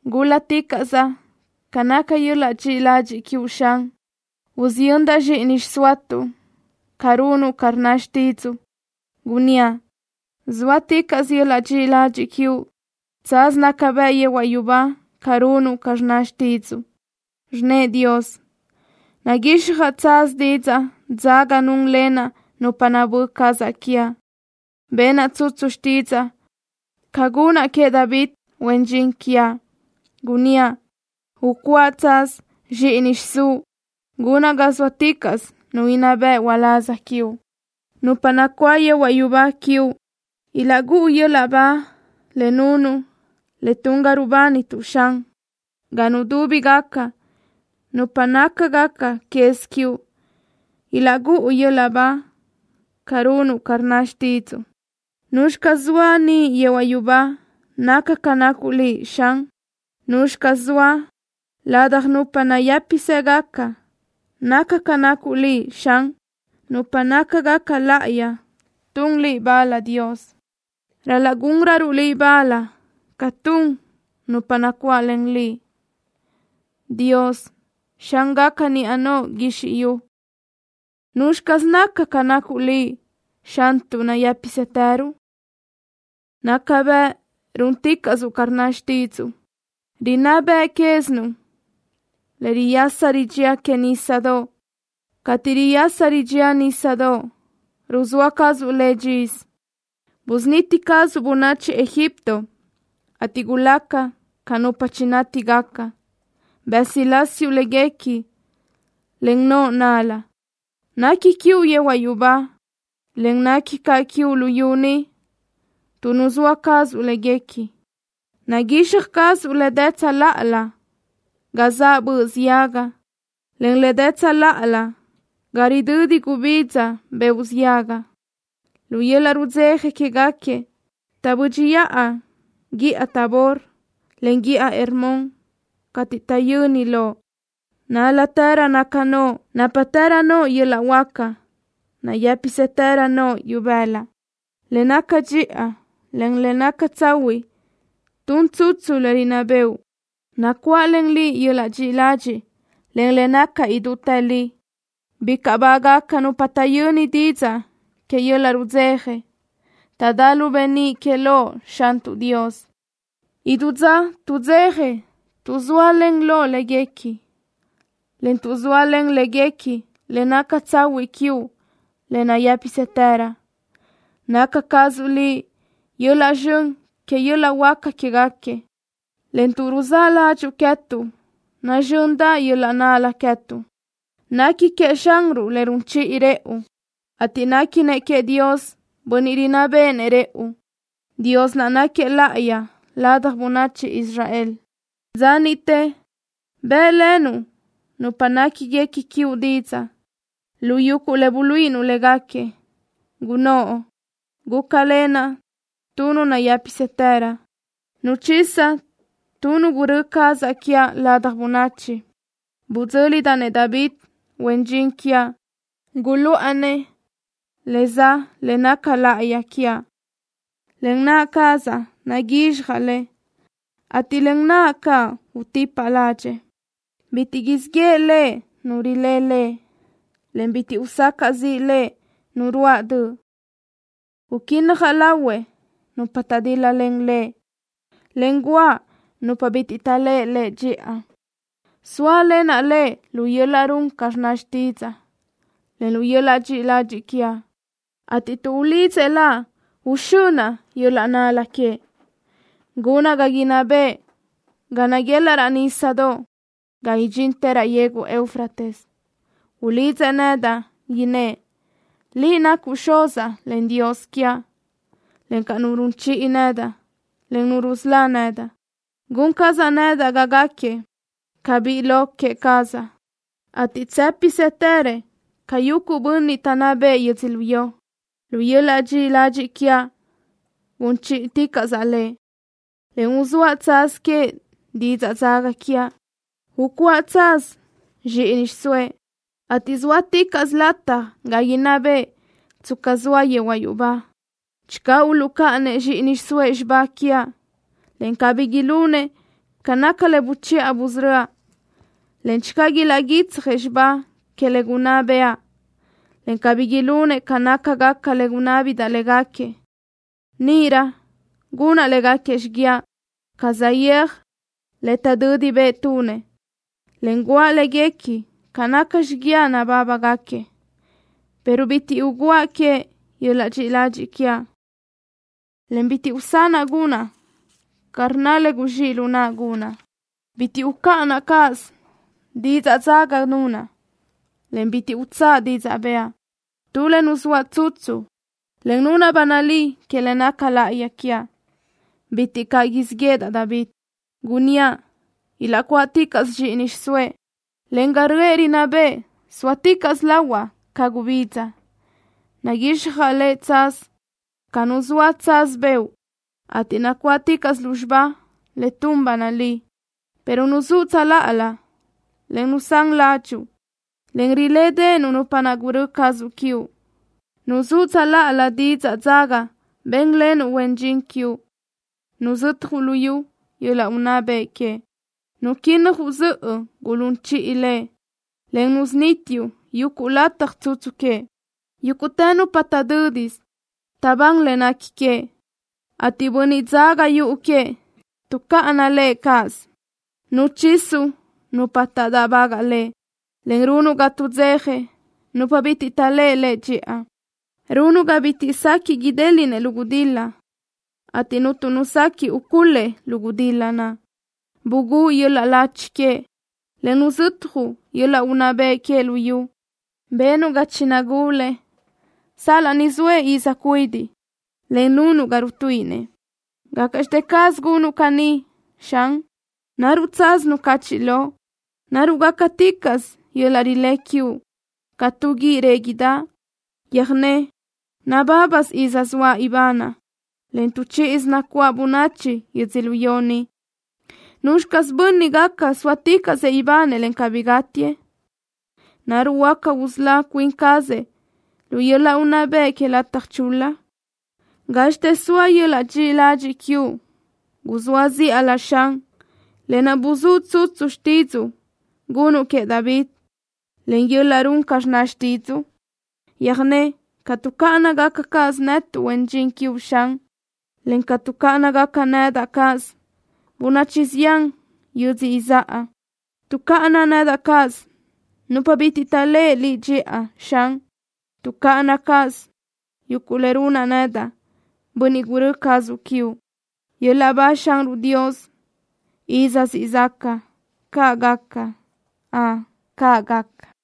Gúl-laticaʼsaʼ ca naca yöl-laʼ dxiʼi ladxiʼ quiuʼ, Xan. Usiyöndaʼ zxíʼini xsoatuʼ ca runuʼ ca rnna xtídzuʼu. Gunníaʼ: “Sóaticaʼsö yöl-laʼ dxiʼi ladxiʼ quiuʼ. Tsaz naca bëʼ yehuaʼ yubá ca runuʼ ca rnna xtídzuʼu.” Rnnëʼ Dios: “Naguixjaʼ tsaz didzaʼ dzaga núnlenaʼ nupa nabö́ cazaʼ quiaʼ. Benaʼ tsutsu xtídzaʼa ca gunaʼ queëʼ David, huen dxin quiaʼ. Gunníaʼ: Ucuáʼa tsaz zxíʼini xiʼsúʼ. Gunaʼ ga sóaticaʼsö nu inná bëʼ uláz quiuʼ.” Nupa nacuáʼ yehuaʼ yubá quiuʼ ilaʼgúʼu yöl-laʼ ba le nunuʼ le tun ga rubánituʼ, Xan. Ga nudúbigaca nupa nácagaca quez quiuʼ ilaʼgúʼu yöl-laʼ ba ca runuʼ ca rnna xtídzuʼu. ¿Nuzxi caz zoa niʼ yehuaʼ yubá naca ca nacuʼ Liʼ, Xan? ¿Nuzxi caz zoa ladaj nupa nayë́pisëgaca naca ca nacuʼ Liʼ, Xan? Nupa nácagaca láʼayi tun Liʼ bal, Dios. Ral-laʼ gúnröruʼ Liʼ bal ca tun nupa nacuáʼlen Liʼ. Dios, Xángaca niʼa noʼo guizxi yu, ¿nuzxi caz naca ca nacuʼ Liʼ, Xantuʼ nayë́pisëtëröuʼ? Naca bëʼ rúnticaʼsuʼ ca rnna xtídzuʼu. Rinná beʼe quézinuʼ le riyasa ridxía que nísadoʼ. Cateʼ riyasa ridxía nísadoʼ, ruzóa cazuʼ le dxisö. Busuniti cazuʼ bönachi Egipto, ateʼ gulaca ca nupa chinátigaca. Bësilásiuʼ léguequi len noʼo nál-la. Nequi quiuʼ yehuaʼ yubá, en nequi caʼ quiuʼ luyú ni, tuʼ nuzóa cazuʼ léguequi. Naguixaj cazuʼ le dë tsöláʼa ga zaʼ böʼ ziaga, en le dë tsöláʼa ga ridödi gubidza beoʼ ziaga. Lu yöl-laʼ rudzeja quéguequi taʼbö́dxiʼa guíʼa Tabor, en guíʼa Hermón cateʼ taʼyöni Loʼ. ¡Nál-latërö naca noʼo! ¡Nápatërö noʼo yöl-laʼ huáca! ¡Nayë́pisëtërö noʼo ibëla! Le naca dxiʼa, en le naca tsahuiʼ tun tsutsu le rinná bëʼu. Nacuáʼlen Liʼ yöl-laʼ dxiʼi ladxiʼ, en le naca idútë li. Bicaʼ bágaca nupa taʼyöni didzaʼ que yöl-laʼ rudzeja. Taʼdá lu beníʼ que loʼ, Xantuʼ Dios. Idú dza tuʼdzeja tuʼ zóalen Loʼ léguequi, en tuʼ zóalen léguequi le naca tsahuiʼ quiuʼ, le nayë́pisëtërö. Naca cazuʼ Liʼ yöl-laʼ zxön que yöl-laʼ huáca quéguequi, en tuʼ ruzáʼ ládxuʼu queë́tuʼ nazxöndaʼ yöl-laʼ nál-la queë́tuʼ. Nequi queëʼ Xanruʼ le run chiʼi rëʼu, ateʼ néquinëʼ queëʼ Dios bönniʼ rinná béʼenëʼ rëʼu. Dios naʼ náquiëʼ láʼayi ladaj bönachi Israel. Dza niʼte bë́ʼlenuʼ nupa néquiguequi quiuʼ didzaʼ lu yuguʼ le buluíʼinuʼ léguequi, gunnóʼ: “Gúcalenaʼ tu nu nayë́pisëtërö. Nuchisaʼ tu nu gurö́ cazaʼ quiaʼ ladaj bönachi. Budzö́lidaʼ-nëʼ David, huen dxin quiaʼ. Guluʼa-nëʼ le za le naca láʼayi quiaʼ. Len naʼ cazaʼ naguixjaʼ lëʼ, ateʼ len naʼa caʼ utipaʼ ládxëʼë. Bitiʼ siʼ yeʼe lëʼ nu rilé lëʼ, en bitiʼ usacaʼ ziʼ lëʼ nu ruáʼ döʼ. Uquínnajaʼ lahuëʼ nupa taʼdíl-lalen lëʼ, en guʼa nupa bitiʼ taʼléʼe lëʼ dxiʼa. Sóalenaʼ lëʼ lu yöl-laʼ run ca rnna xtídzaʼa, en lu yöl-laʼ dxiʼi ladxiʼ quiaʼ, ateʼ tuʼ ulidzëʼ Laʼ, uxönaʼ yöl-laʼ nál-la queëʼ. Gunaʼ ga inná bëʼë ga naguelaʼ raʼ nísadoʼ, ga idxintë raʼ yegu Eufrates. Ulidzëʼ nedaʼ, innë́ʼ: Liʼ nacuʼ Xuzaʼ, en Dios quiaʼ, encaʼ Nu run chiʼi nedaʼ, en Nu rusölá nedaʼ. Gun cazaʼ nedaʼ ga gáquiëʼ ca biʼi lo queë cazaʼ, ateʼ tsë́pisëtërëʼ ca yuguʼ bönniʼ taʼnná bëʼë yödzölió. Lu yöl-laʼ dxiʼi ladxiʼ quiaʼ gun chíʼiticaʼsaʼ lëʼ, en uzóaʼ tsaz queëʼ didzaʼ dzaga quiaʼ. Ucuáʼa tsaz zxíʼini xiʼsóëʼ, ateʼ sóaticaʼsö lataj ga inná bëʼë, tsca soa yehuaʼ yubá. Channö uluʼcáʼanëʼ zxíʼini xiʼsóëʼ xibá quiaʼ, en cabí ilunëʼ ca naca le buchiʼa busörö́aʼ, en channö ilaʼguitsjëʼ xibá que le gunná bëʼa, en cabí ilunëʼ ca nácagaca le gunná béʼedaʼ légaquiëʼ, níʼirö gunaʼ légaquiëʼ xiguiaʼ ca saʼyéaj le taʼdödi bëʼ tunëʼ, en guʼa léguequi ca naca xiguiaʼ nabágaʼgaquiëʼ. Pero bitiʼ ugúaʼ queëʼ yöl-laʼ dxiʼi ladxiʼ quiaʼ, en bitiʼ usanaʼ gunaʼ ca rnna le guzxíʼ lu naʼa gunaʼ. Bitiʼ ucáʼanaʼ cáʼasö didzaʼ dzaga nunaʼ, en bitiʼ utsáʼa didzaʼ bëʼa. Tu le nuzóaʼ tsutsu, en nunaʼ ba nalí que le naca láʼayi quiaʼ. Bitiʼ caʼ siʼ yéʼedaʼ David. Gunníaʼ ilaʼcuáʼticaʼsëʼ zxíʼini xiʼsóëʼ, en ga röʼë rinná bëʼë sóaticaʼsö lahuaʼ ca gubidza. Naguixjaʼ le tsaz ca nuzóaʼ tsaz beoʼ, ateʼ nacuáʼticaʼsö lúzxiba le tun ba nalí.” Pero nuzúʼ tsöláʼalö, en nusán ládxuʼu, en rilédeʼenuʼ nupa naʼ gurö́ cazuʼ quiuʼ. Nuzúʼ tsöláʼalö didzaʼ dzaga bénlenuʼ huen dxin quiuʼ. Nuzötjuʼ luyú yöl-laʼ unná bëʼ queëʼ. Nuquínnajuʼ zöʼö gulún chiʼi lëʼ, en nusunítiuʼ yuguʼ lataj tsutsu queëʼ. Yúguʼtë nupa taʼdö́disö taʼbán le nequi queëʼ, ateʼ bönniʼ dzaga yuʼu queëʼ tuʼcáʼana lëʼ cáʼasö. Nuchisuʼ nupa taʼdáʼbagaʼ lëʼ, en runuʼ ga tuʼdzeja nupa bitiʼ taʼléʼe lëʼ dxiʼa. Runuʼ ga bitiʼ sequiʼ idéliʼnëʼ lu gudil-la, ateʼ cuntu nu sequiʼ ucul-lëʼ lu gudil-la naʼ. Bugúʼ yöl-laʼ lachi queëʼ, en nuzötjuʼ yöl-laʼ unná bëʼ queëʼ lu yu. Benuʼ ga chinagulëʼ sal-laʼ ni zoëʼ iz cuidiʼ, en nunuʼ ga rutuíʼinëʼ. ¿Gácaʼxte caz gunuʼ caní, Xan? ¿Naruʼ tsaz nucachiʼ loʼ? ¿Naruʼ gácaticaʼsö yöl-laʼ rilé quiuʼ ca tu guíʼ réguideʼe? Yöjné nabábasö iz soaʼ ibanaʼ, en tu chíʼisö nacuáʼ bönachi yödzölió ni. ¿Nuzxi caz bönniʼ gaca sóaticaʼsëʼ ibanëʼ, en cabí gátiëʼ? ¿Naruʼ huáca usölá cuin cazëʼ lu yöl-laʼ unná bëʼ que lataj chul-la? ¿Gázxitë zoa yöl-laʼ dxiʼi ladxiʼ quiuʼ guzóa zíʼalö, Xan, lë naʼ buzúʼ tsutsu xtídzuʼu gunuʼ queëʼ David, len yöl-laʼ run ca rnna xtídzuʼu? Yöjné ca tuʼcáʼana cáʼasö netuʼ, huen dxin quiuʼ, Xan, encaʼ ca tuʼcáʼana nedaʼ cáʼasö bönachi zián yödzö izáʼa. Tuʼcáʼana nedaʼ cáʼasö nupa bitiʼ taʼléʼe Liʼ dxiʼa, Xan. Tuʼcáʼana cáʼasö yuguʼ le runaʼ nedaʼ, bönniʼ gurö́ cazuʼ quiuʼ. ¡Yöl-laʼ ba Xanruʼ Dios iz siʼ zaca! ¡Caʼ gaca! ¡Ön, caʼ gaca!